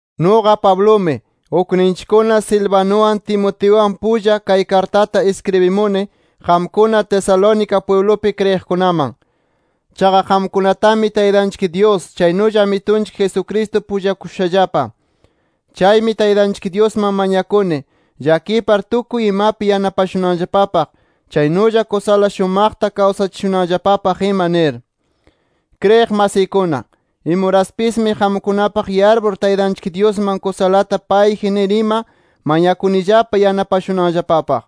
Nuqa Pablumi, ukninchikkuna Silvanuwan, Timoteuwan pulla, kay kartata iskribimuni qamkuna Tesalónica pwiblupi kriyiqkunaman. Chaqa qamkunatami Taytanchik Dyus chaynulla Amitunchik Jesucristo pullakushushallapa. Chaymi Taytanchik Dyusman mañakuni, llakipar tukuy imapi yanapashunanllapapaq, chaynulla kusala shumaqta kawsachishunanllapapaq ima nir. Kriyiq masiykuna, imuraspismi qamkunapaq yarpur Taytanchik Dyusman kusalata payji nir ima, mañakunillapa yanapashunanllapapaq.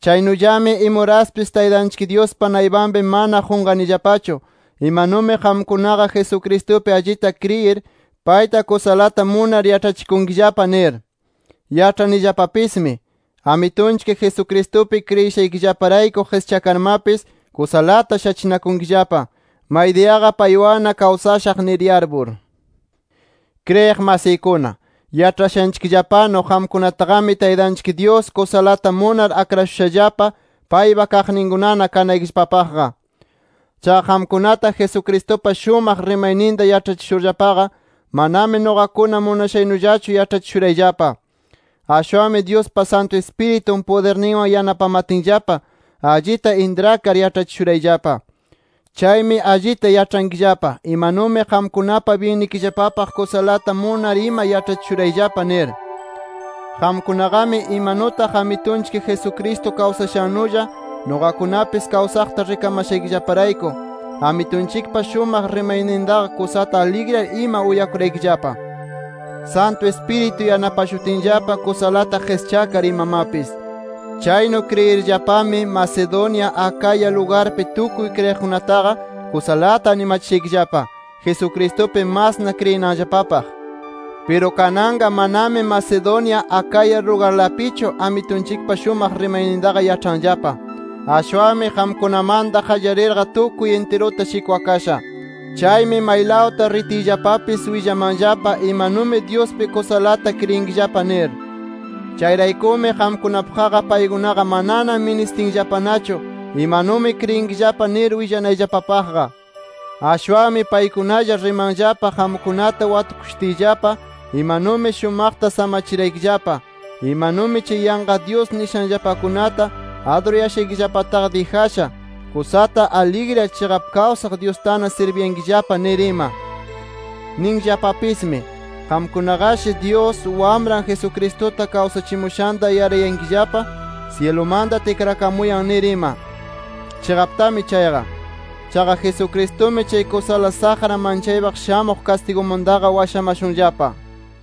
Chaynullami imuraspis Taytanchik Dyuspa naypanpi mana qunqanillapachu, imanumi qamkunaqa Jesucristupi allita kriyir, payta kusalata munar yaĉhachikunkillapa nir. Yaĉhanillapapismi Amitunchik Jesucristupi kriyishaykillaparayku qischakarmapis, kusalata shachinakunkillapa, maydiyaqa paywanna kawsashaq nir yarpur. Kriyiq masiykuna, yaĉhashanchikllapanu qamkunataqami Taytanchik Dyus kusalata munar akrashushallapa paypa kaqninkunana kanaykillapapaqqa. Chaqa qamkunata Jesucristupa shumaq rimayninta yaĉhachishurllapaqa, manami nuqakuna munashaynullachu yaĉhachishurayllapa. Ashwanmi Dyuspa Santu Ispiritun pudirninwan yanapamatinllapa, allita intrakar yaĉhachishurayllapa. Chaymi allita yaĉhankillapa, imanumi qamkunapa byinnikillapapaq kusalata munar ima yaĉhachishurayllapa nir. Qamkunaqami imanutaq Amitunchik Jesucristo kawsashannulla nuqakunapis kawsaqta rikamashaykillaparayku, Amitunchikpa shumaq rimaynintaqa kusata aligriyar ima uyakuraykillapa, Santu Ispiritu yanapashutinllapa kusalata qischakar imamapis. Chaynu kriyirllapami Macedonia, Acaya lugarpi tukuy kriyiqkunataqa kusalata animachishaykillapa, Jesucristupi masna kriyinanllapapaq. Piru kananqa manami Macedonia, Acaya lugarlapichu Amitunchikpa shumaq rimaynintaqa yaĉhanllapa. Ashwanmi qamkunamanta qallarirqa tukuy intiruta shikwakasha. Chaymi maylawta ritiyllapapis willamanllapa imanumi Dyuspi kusalata kriyinkillapa nir. Chayraykumi qamkunapaqqa paykunaqa manana ministinllapanachu imanumi kriyinkillapa nir willanayllapapaqqa. Ashwanmi paykunalla rimanllapa qamkunata watukushutiyllapa imanumi shumaqta samachimaraykillapa, imanumi chay yanqa dyus nishanllapakunata adurayashaykillapata dijasha, kusata aligriyar chiqap kawsaq Dyustana sirbiyankillapa nir ima. Ninllapapismi, qamkunaqashi Dyus, Wamran Jesucristuta kawsachimushanta yarayankillapa syilumanta tikrakamuyan nir ima. Chiqaptami chayqa. Chaqa Jesucristumi chay kusala saqra manchaypaq shamuq kastigumantaqa washamashunllapa.